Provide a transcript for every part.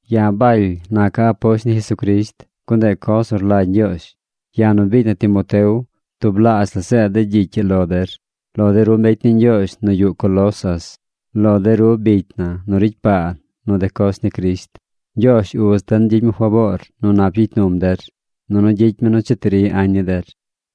Ya̱ Baly naca̱ aposht ni Jesucrisht, gun ndeꞌ coz nu rlagy Ñgyoozh. Ya̱ nu biicy na Timoteo tublaazh la zeed de̱ gyicy ii lo der, lo de ru mbecy ni Ñgyoozh nu yuꞌ Colosas, lo de ru bicy na nu ricy paa nu de coz ni Crisht. Ñgyoozh Uz den gyicy mi faboor nu nap gyicy num der, nunu gyicy mi nu cheti ri añ ni der.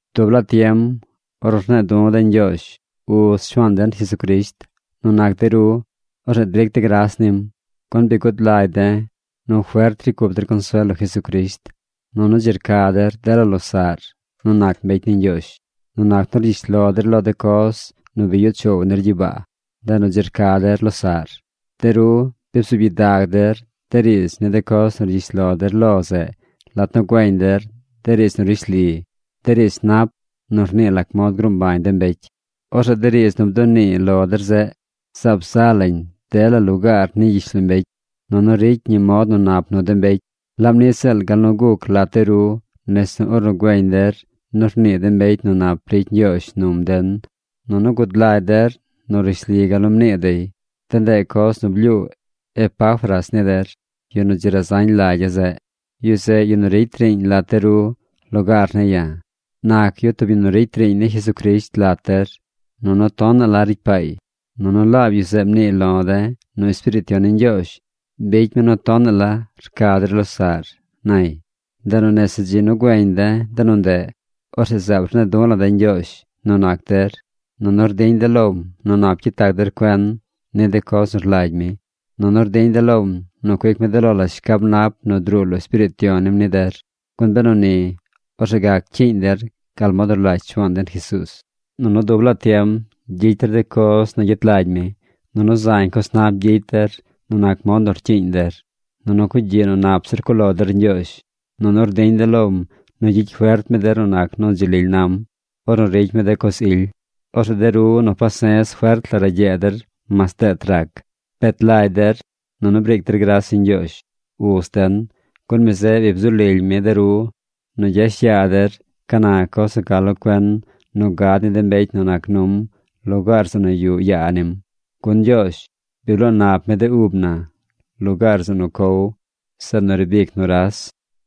Dub laa tiem ornu rne̱e̱ du̱ de̱ Ñgyoozh, Uz Shuaan den Jesucrisht, nu nac de ru, orzeꞌ dric de̱ gras nim. Gun bi gud lagy de̱ nu fert ricy cup der consuel lo Jesucrisht, nunu dzi rca der dela losaꞌr nu nac mbecy ni Ñgyoozh. Nu nac nu rgyish lo der lo de coz nu bi yuꞌ choow nir gyibaa, ndeꞌ nu dzi rca der losaꞌr. De ru bi bzuub gyidag der de riidz ni de coz nu rgyish lo der lo zeꞌ lat nu güeñ der de riidz nu rishli, de riidz nap nu rnii lac mod gruu mbañ de mbecy. Orzeꞌ de riidz nu bdunii lo der zeꞌ, zaab za lañ dela lugaar ni gyishlombecy, nunu ricy ñi mod nu nap nu de mbecy, laab niꞌ ziꞌl gal nu guc lat de ru nese ornu güeñ der nu rnii de mbecy nu nap ricy Ñgyoozh num den nunu gud lagy der nu rishli gal nu mnii dey. De ndeꞌ coz nu blyuu Epafras ni der, yu nu dzi razañ lagya̱ zeꞌ. Yu zeꞌ yu nu ricy riiñ lat de ru lugaar ne̱ ya̱. Nac yu tub yu nu ricy riiñ ni Jesucrisht lat der, nunu tonaꞌ la ricy paay. Nunu laab yu zeꞌ mniiy lo̱ de̱ nu Espiriit Yon ni Ñgyoozh bicy mi nu tonaꞌ la rca der losaꞌr, nay. Ndeꞌ nu nese dzi nu güeñ de̱ de nu ndeꞌ, orzeꞌ zaab rne̱e̱ du̱ la̱ de̱ Ñgyoozh nu nac der, nunu rdiñ de̱ lom nu nap gyet lag der cuen ni de coz nu rlagy mi, nunu rdiñ de̱ lom nu cuic mi de lo la shcab nap nu druu lo Espiriit Yon nim ni der. Gun benu ni, orzeꞌ gac cyiiñ der gal mod nu rlagy Shuaan den Jesuuz, nunu dub laa tiem gyicy der de coz nu gyet lagy mi. Nunu zañ coz nap gyicy der nu nac mod nu rcyiiñ der. Nunu cugyiꞌ nu nap zir cuꞌ lo der Ñgyoozh. Nunu rdiñ de̱ lom nu gyicy fert mi der nu nac nu dzi lily nam ornu ricy mi de coz ily. Orzeꞌ de ru nu pase̱z fert la ragyee der mas deet rac. Bet lagy der, nunu briic der gras ni Ñgyoozh, Uz den, gun mi zeꞌ bi bzu lily mi de ru nu gyash yaa der ca na coz nu ca lo cuen nu gad ni de mbecy nu nac num lugaar zeꞌ nu yuꞌ yaa nim. Gun Ñgyoozh bi bloo nap mi de ub na lugaar zeꞌ nu cow, zeꞌ nu riib ic nuras.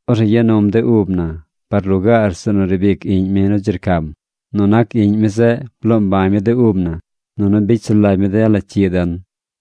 Orzeꞌ ya num de ub na par lugaar zeꞌ nu riib ic Iꞌñ mi nu dzi rcam. Nu nac Iꞌñ mi zeꞌ bloo mbañ mi de ub na, nunu bicy sulagy mi dela cyi den.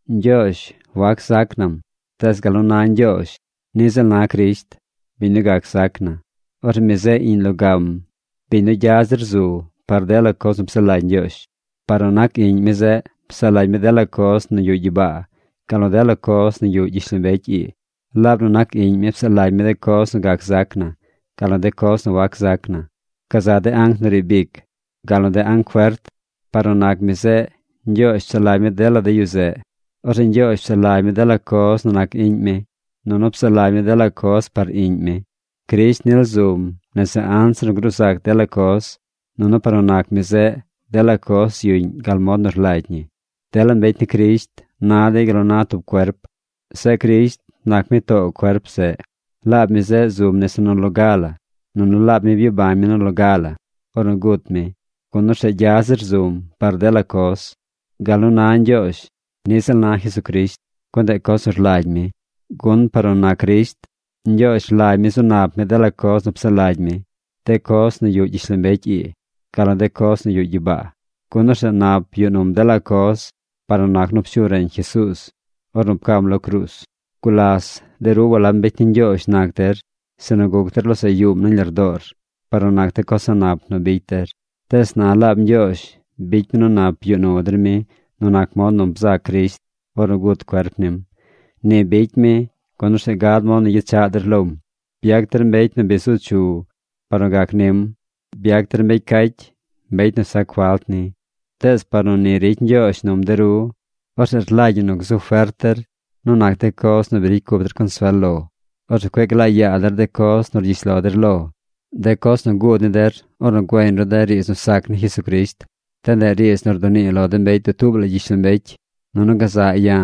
Ñgyoozh wac zac nam, tees gal nu na Ñgyoozh niꞌ ziꞌl na Crisht, biñ nu gac zac na. Orzeꞌ mi zeꞌ Iꞌñ logam, biñ nu gya zir zu par dela coz nu psaꞌ lagy Ñgyoozh. Par nu nac Iꞌñ mi zeꞌ psaꞌ lagy mi dela coz nu yuꞌ gyibaa, gal nu dela coz nu yuꞌ gyishlombecy ii. Laab nu nac Iꞌñ mi psaꞌ lagy mi de coz nu gac zac na, gal nu de coz nu wac zac na. Gazaꞌ de anc nu riib ic, gal nu de anc fert, par nu nac mi zeꞌ Ñgyoozh psaꞌ lagy mi dela de yu zeꞌ. Orzeꞌ Ñgyoozh psaꞌ lagy mi dela coz nu nac Iꞌñ mi, nunu psaꞌ lagy mi dela coz par Iꞌñ mi. Crisht nil zum nese anzir nu gruu zac dela coz, nunu par nu nac mi zeꞌ, dela coz yuꞌñ gal mod nu rlagy ñi. Dela mbecy ni Crisht na dey gal nu na tub cuerp. Zeꞌ Crisht nac mi too cuerp zeꞌ. Laab mi zeꞌ zum nese nu loga la. Nunu laab mi byabañ mi nu loga la ornu gut mi, gun orzeꞌ gya zir zum par dela coz. Gal nu na Ñgyoozh niꞌ ziꞌl na Jesucrisht, gun ndeꞌ coz nu rlagy mi. Gun par nu nac Crisht, Ñgyoozh rlagy mi zu nap mi dela coz nu psaꞌ lagy mi, de coz nu yuꞌ gyishlombecy ii, gal nu de coz nu yuꞌ gyibaa. Gun orzeꞌ nap yuꞌ num dela coz par nu nac nu pshu reñ Jesuuz ornu pcam lo cruuz. Gulas de ru walab mbecy ni Ñgyoozh nac der, sinu guc der losaꞌ yuum nañ lardoor par nu nac de coz a̱ꞌ nap nu bicy der. Tees na laab Ñgyoozh bicy mi nu nap yuꞌ nu der mi nu nac mod nu bzac Crisht ornu gut cuerp nim. Ni bicy mi, gun orzeꞌ gad mod nu gyechaꞌ der lom. Byac der mbecy nu bi zu chu par nu gac nim. Byac der mbecy cacy, mbecy nu sac falt ni. Tees par nu ni ricy Ñgyoozh num de ru, orzeꞌ rlagy ñi nu gzu fert der nu nac de coz nu bi ricy cup der consuel lo. Orzeꞌ cueꞌ glaa yaa der de coz nu rgyish lo der lo, de coz nu guud ni der ornu güeñ ru de riidz nu sac ni Jesucrisht. De ndeꞌ riidz nu rdunii lo de mbecy dutuub la gyishlombecy. Nunu gaza̱ꞌ ya̱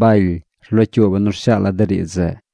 Baly rlocyuuba̱ nu rshaala̱ de riidz zeꞌ.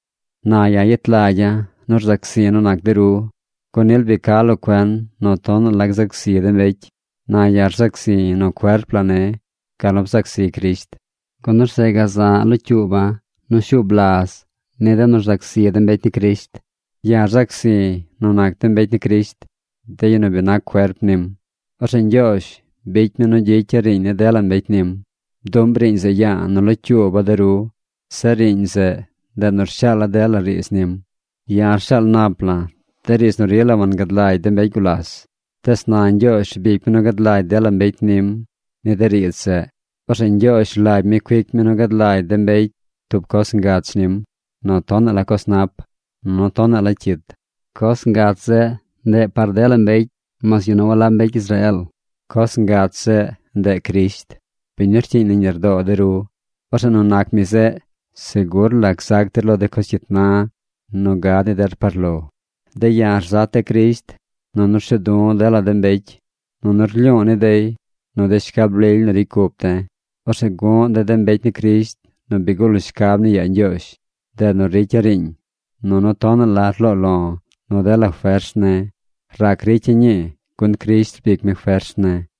Na ya̱ yet lagya̱ nu rzac zi̱ nu nac de ru, gun nil bi ca lo cuen nu tonaꞌ la gzac zi de mbecy. Na ya̱ rzac zi̱ nu cuerp la ne̱ gal nu bzac zi Crisht, gun orzeꞌ gaza̱ꞌ locyuuba̱ nu shuub laz ni de nu rzac zi de mbecy ni Crisht. Ya̱ rzac zi̱ nu nac de mbecy ni Crisht, de yu nu bi nac cuerp nim. Orzeꞌ Ñgyoozh bicy mi nu gyicya̱ riiñ ni dela mbecy nim. Bduꞌm riiñ zeꞌ ya̱a̱ nu locyuuba̱ de ru. Zeꞌ riiñ zeꞌ, ndeꞌ nu rshaala̱ dela riidz nim. Ya̱ rshaal nap la̱ de riidz nu rila wangad lagy de mbecy gulas. Tees na Ñgyoozh rbic mi nu gad lagy dela mbecy nim ni de riidz zeꞌ. Orzeꞌ Ñgyoozh rlagy mi cuic mi nu gad lagy de mbecy tub coz ngach nim nu tonaꞌ la coz nap, nunu tonaꞌ la cyit. Coz ngach zeꞌ, ndeꞌ par dela mbecy mas yu nu walab mbecy Israeel. Coz ngach zeꞌ, ndeꞌ Crisht, biñ nu rcyiiñ nañ lardoo de ru. Orzeꞌ nu nac mi zeꞌ segur la gzac der lo de coz cyit na nu gad ni der par lo. De̱ ya̱ rzat de̱ Crisht, nunu rshu̱u̱ du̱ de̱ dela mbecy, nunu rlyu̱u̱ ni dey nu de shcab lily nu ricy cup de̱. Orzeꞌ gu̱ꞌ de̱ de mbecy ni Crisht nu bi gul shcab ni yaa Ñgyoozh. Ndeꞌ nu ricya̱ riiñ, nunu tonaꞌ la rloo lo̱ nu dela fers ne̱. Rac ricya̱ ñii gun Crisht rbic mi fers ne̱.